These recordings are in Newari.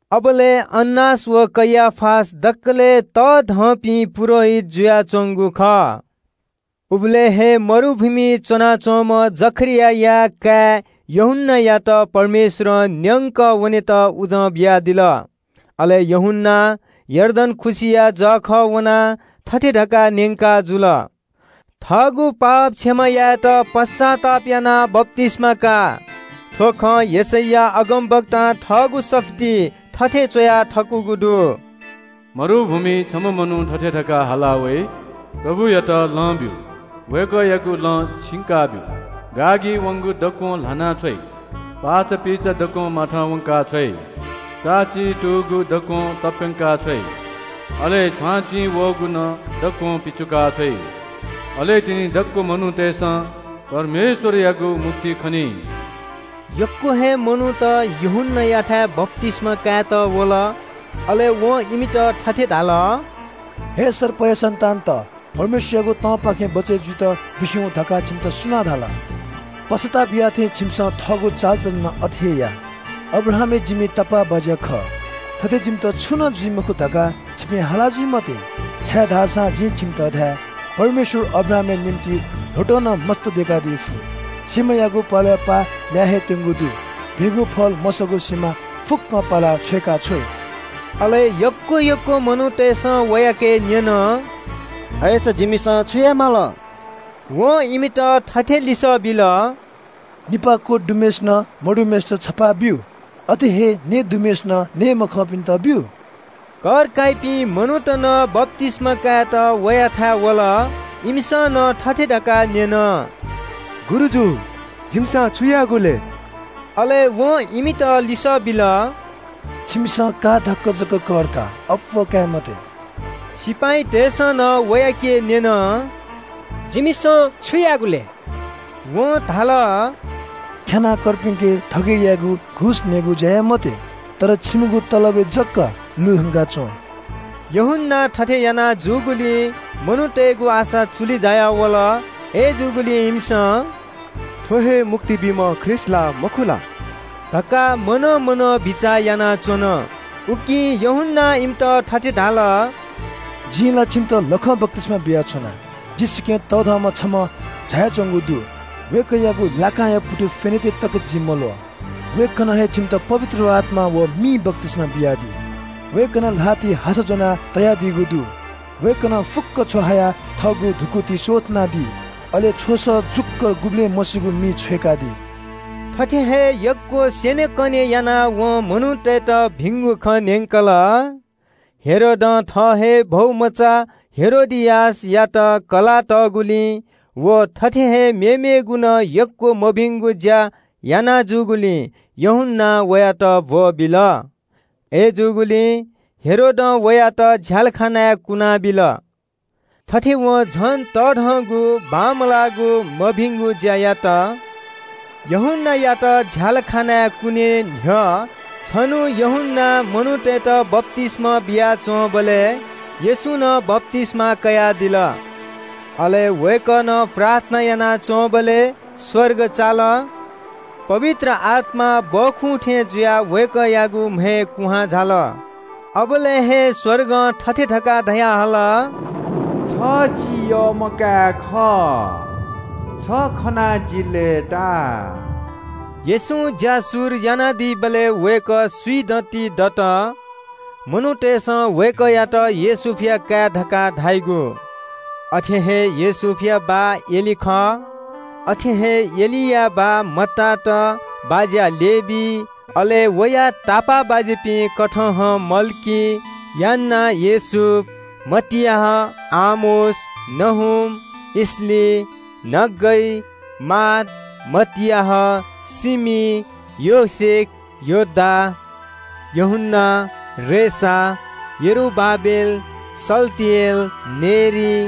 अबलय् हन्नास व कैयाफा दकलय् तःधंपिं पुजाहारीत जुयाच्वंगु खः। उबलय् हे मरुभूमिइ च्वनाच्वंम्ह जकरियाया काय् यूहन्नायात परमेश्वरं न्यंकः वनेत उजं बियादिल। अले यूहन्नां यर्दन खुसिया जःखः वनाः थथे धकाः न्यंकाजुल – “थःगु पाप क्षमा यायेत पश्चाताप यानाः बप्तिस्मा का।” थ्व खँ यशैया अगमवक्तां थःगु सफुलिइ थथे च्वया थकूगु दु – “मरुभूमिइ छम्ह मनू थथे धकाः हाला वइ – ‘परमप्रभुयात लँ ब्यु, वय्कःयागु लँ छिंकाब्यु। गाःगी वंगु दक्वं ल्हाना छ्वइ। पाःचापीचा दक्वं माथं वंका छ्वइ। चाःची तूगु दक्वं तप्यंका छ्वइ। अले छ्वांछिं वःगु नं दक्वं पिचुका छ्वइ। अले तिनि दक्व मनूतय्सं परमेश्वरयागु मुक्ति खनी।’” यक्व हे मनूत यूहन्नायाथाय् बप्तिस्मा कायेत वल। अले वं इमित थथे धाल – “हे सर्पया सन्तान, परमेश्वरयागु तंपाखें बचय् जुइत बिस्युं हुँ धकाः छिमित सुनां धाल? पश्चाताप याःथें छिमिसं थःगु चालचलन नं अथे हे या। ‘अब्राहाम हे जिमि तापाःबाज्या खः, थथे जिमित छुं नं जुइ मखु’ धकाः छिपिं हाला जुइ मते, छाय्धाःसा जिं छिमित धाये – परमेश्वरं अब्राहामया निंतिं ल्वहँतं नं मस्त दय्कादी फु। सिमायागु प्वलय् पाः लाये हे त्यंगु दु। भिंगु फल मसःगु सिमा फुक्कं पालाः छ्वय्काछ्वइ।” अले यक्व यक्व मनूतय्सं वयाके न्यन – “अय्सा जिमिसं छु याये माल?” वं इमित थथे लिसः बिल – “निपाः लं दुम्हय्सिनं मदुम्हय्सित छपाः ब्यु। अथे हे नयेगु दुम्हय्सिनं नये मखंपिन्त ब्यु।” कर काइपिं मनूत नं बप्तिस्मा कायेत वयाथाय् वल। इमिसं नं थथे धकाः न्यन – “गुरुजु, जिमिसं छु यायेगु लय्?” अले वं इमित लिसः बिल – “छिमिसं का धाक्व जक कर का, अप्वः काये मते।” सिपाइँतय्सं नं वयाके न्यन – “जिमिसं छु यायेगु लय्?” वं धाल – “ख्यानाः कर्पिन्के थगय् यायेगु, घुस नयेगु ज्या याये मते। तर छिमिगु तलबय् जक लुधंका च्वँ।” यूहन्नां थथे याना जूगुलिं मनूतय्गु आशा चुलि जायावल। अय्जूगुलिं इमिसं – “थ्व हे मुक्ति बीम्ह ख्रीष्ट ला मखु ला” धकाः मनं मनं बिचाः यानाच्वन। उकिं यूहन्नां इमित थथे धाल – “जिं ला छिमित लखं बप्तिस्मा बियाच्वना। जि स्वयाः तःधंम्ह छम्ह झायाच्वंगु दु। वय्कःयागु लाकांया पुतु फ्यनेत तकं जि मल्वः। वय्कलं हे छिमित पवित्र आत्मां व मिं बप्तिस्मा बियादी। वय्कलं ल्हातिइ हासा ज्वना तयादीगु दु। वय्कलं फुक्क छ्व हायाः थःगु धुकुतिइ स्वथनादी। अले छ्वस जुक्व गुबलें मसीगु मिइ छ्वय्कादी।” थथे हे यक्व स्यनेकने यानाः यूहन्नां मनूतय्त भिंगु खँ न्यंकल। हेरोदं थः हे भौमचा हेरोदियासयात कलाः तःगुलिं व थथे हे मेमेगु नं यक्व मभिंगु ज्या याना जूगुलिं यूहन्नां वयात ब्वःबिल। अय्जूगुलिं हेरोदं वयात झ्यालखानाय् कुनाबिल। थथे वं झन तःधंगु बांमलाःगु, मभिंगु ज्या यात। यूहन्नायात झ्यालखानाय् कुने न्ह्यः छन्हु यूहन्नां मनूतय्त बप्तिस्मा बियाच्वंबलय् येशूं नं बप्तिस्मा कयादिल। वय्कलं प्रार्थना यानाच्वंबलय् स्वर्ग चाल। पवित्र आत्मा सुकुभतु थें जुयाः वय्कःयागु म्हय् कुहां झाल। अबलय् हे स्वर्गं थथे धकाः धयाहल – “छ जि यःम्ह काय् खः। छ खनाः जि लय्ताः।” येशूं ज्या शुरु यानादीबलय् वय्कः स्विदँति दत। मनूतय्सं वय्कःयात योसेफया काय् धकाः धाइगु। अथे हे योसेफया बाः एली खः। अथे हे एलिया बाः मत्तात, बाज्या लेवी, अले वया तापाःबाज्यापिं कथहं मल्की, यान्ना, योसेफ, मत्ताथियास, आमोस, नहूम, इसली, नग्गै, माथ, मत्ताथियास, सेमैन, योसेख, योदा, योआनन, रेसा, यरूबाबेल, शालतिएल, नेरी,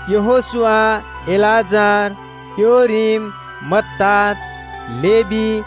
यहोशू, एलीएजर, योरीम, मत्तात, लेवी,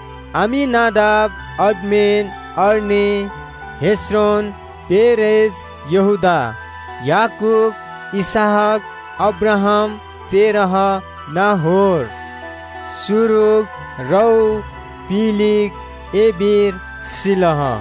अम्मीनादाब, आराम, अरनी, हेस्रोन, फारेस, यहूदा, याकूब, इसहाक, अब्राहाम, तेरह, नाहोर, सरूग, रऊ, पेलेग, एबेर, शेलह,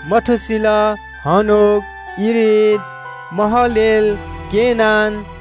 मतूशेलह, हनोक, येरेद, महलालेल, केनान,